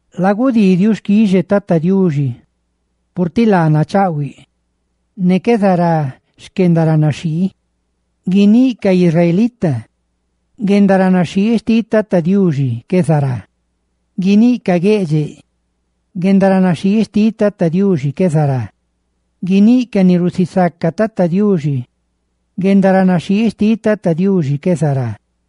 Lagudii xquixe Tata Diuxi, purtiꞌ laa nachaꞌhuiꞌ, ne qué zará xquendaranaxhii. Guiníꞌ ca israelita: «Guendaranaxhii xtiꞌ Tata Diuxi qué zará.» Guiníꞌ ca gueꞌdxeꞌ: «Guendaranaxhii xtiꞌ Tata Diuxi qué zará.» Guiníꞌ ca ni rusisaca Tata Diuxi: «Guendaranaxhii xtiꞌ Tata Diuxi qué zará.»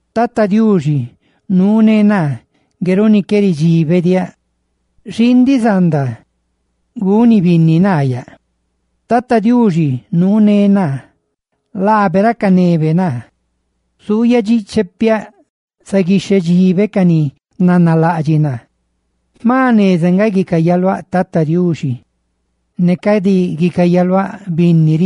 Tata Diuxi nuuné naa; ngue runi qué ridxibediáꞌ. Xii ndiꞌ zanda guni binni naa yaꞌ. Tata Diuxi nuuné naa; laabe racanebe naa. ¡Zuuyaꞌ dxíꞌchepiaꞌ ra gata dxí ca ni nanalaꞌdxiꞌ naa! Jma jneza nga guicayaluáꞌ Tata Diuxi ne cadi guicayaluáꞌ binni.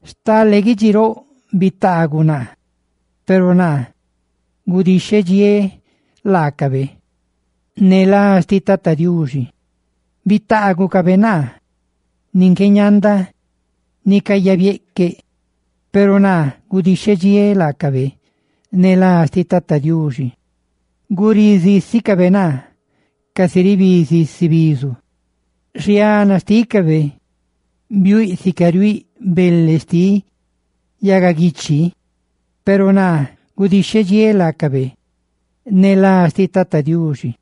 Stale guidxi roꞌ bitaaguꞌ naa, peru naa gudixhedxiéꞌ laacabe ne lá Tata Diuxi. Bitaagucabe naa nin qué ñanda nicayabieꞌqueꞌ, peru naa gudixhediéꞌ laacabe ne lá Tata Diuxi. Gurí zísicabe naa casi ribí zisi bizu, xiana xtícabe biuiꞌ sica riuiꞌ bele xtiꞌ yagaguiichi; ¡peru naa gudixhediéꞌ laacabe ne lá Tata Diuxi!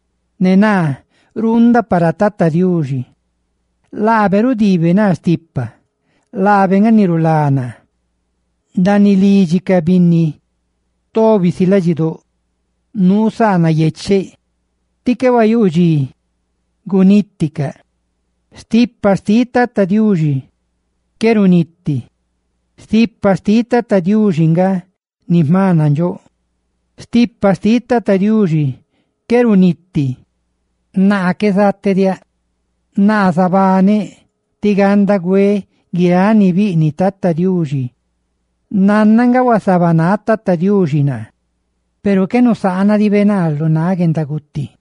Ne naa ruundaꞌ para Tata Diuxi, laabe rudiibe naa stipa. ¡Laabe nga ni rulá naa! Ndaaniꞌ lidxi ca binni tobi si ladxidóꞌ nuu saa nayecheꞌ ti qué huayuu dxi guniticaꞌ: «¡Stipa xtiꞌ Tata Diuxi qué runiti! ¡Stipa xtiꞌ Tata Diuxi nga ni jma nandxóꞌ! ¡Stipa xtiꞌ Tata Diuxi qué runiti!» ¡Naa qué zatediáꞌ, naa zabaneꞌ tí ganda güeꞌ guiráꞌ ni biꞌniꞌ Tata Diuxi! Naná nga huasabanáꞌ Tata Diuxi naa, peru qué nusaanadibe naa lu náꞌ guendaguti.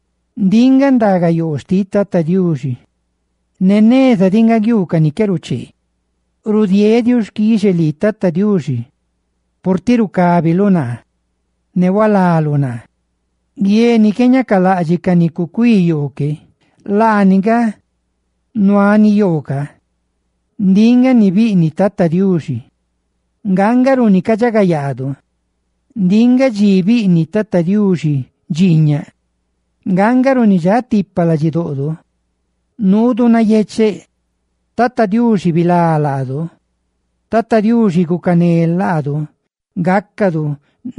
Ndiꞌ nga ndagayoo xtiꞌ Tata Diuxi, ne neza diꞌ nga guiuu ca ni qué ruchee. Rudieeꞌ xquixe lii, Tata Diuxi, purtiꞌ rucábiluꞌ naa ne purtiꞌ rulaluꞌ naa. Guie ni qué ñacalaꞌdxiꞌ ca ni cucuí yoo que, laani nga guie nuaꞌ yoo ca. Ndiꞌ nga ni biꞌniꞌ Tata Diuxi, nga nga runi cadxagayaadu. Ndiꞌ nga dxi ni biꞌniꞌ Tata Diuxi dxiiñaꞌ; ¡nga nga runi dxatipa ladxidoꞌdo, nuudu nayecheꞌ! Tata Diuxi, ¡bilá laꞌ laadu! Tata Diuxi, gucané laꞌ laadu, ¡gácadu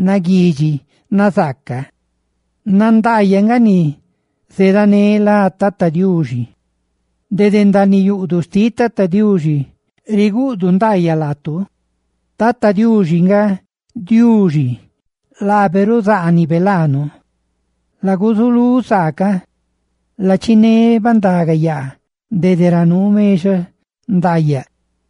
naguidxi ne nazaaca! ¡Nandaayaꞌ nga ni zeeda ne lá Tata Diuxi! Dede ndaaniꞌ yuꞌduꞌ xtiꞌ Tata Diuxi riguꞌdu ndaayaꞌ laatu. Tata Diuxi nga Diuxi; ¡laabe ruzaanibe laanu! Laguzulú saa ne lachiné bandaga yaa dede ra nuu mexaꞌ ndaayaꞌ.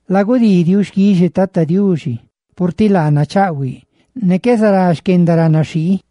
Lagudii xquixe Tata Diuxi, purtiꞌ laa nachaꞌhuiꞌ, ne qué zará xquendaranaxhii.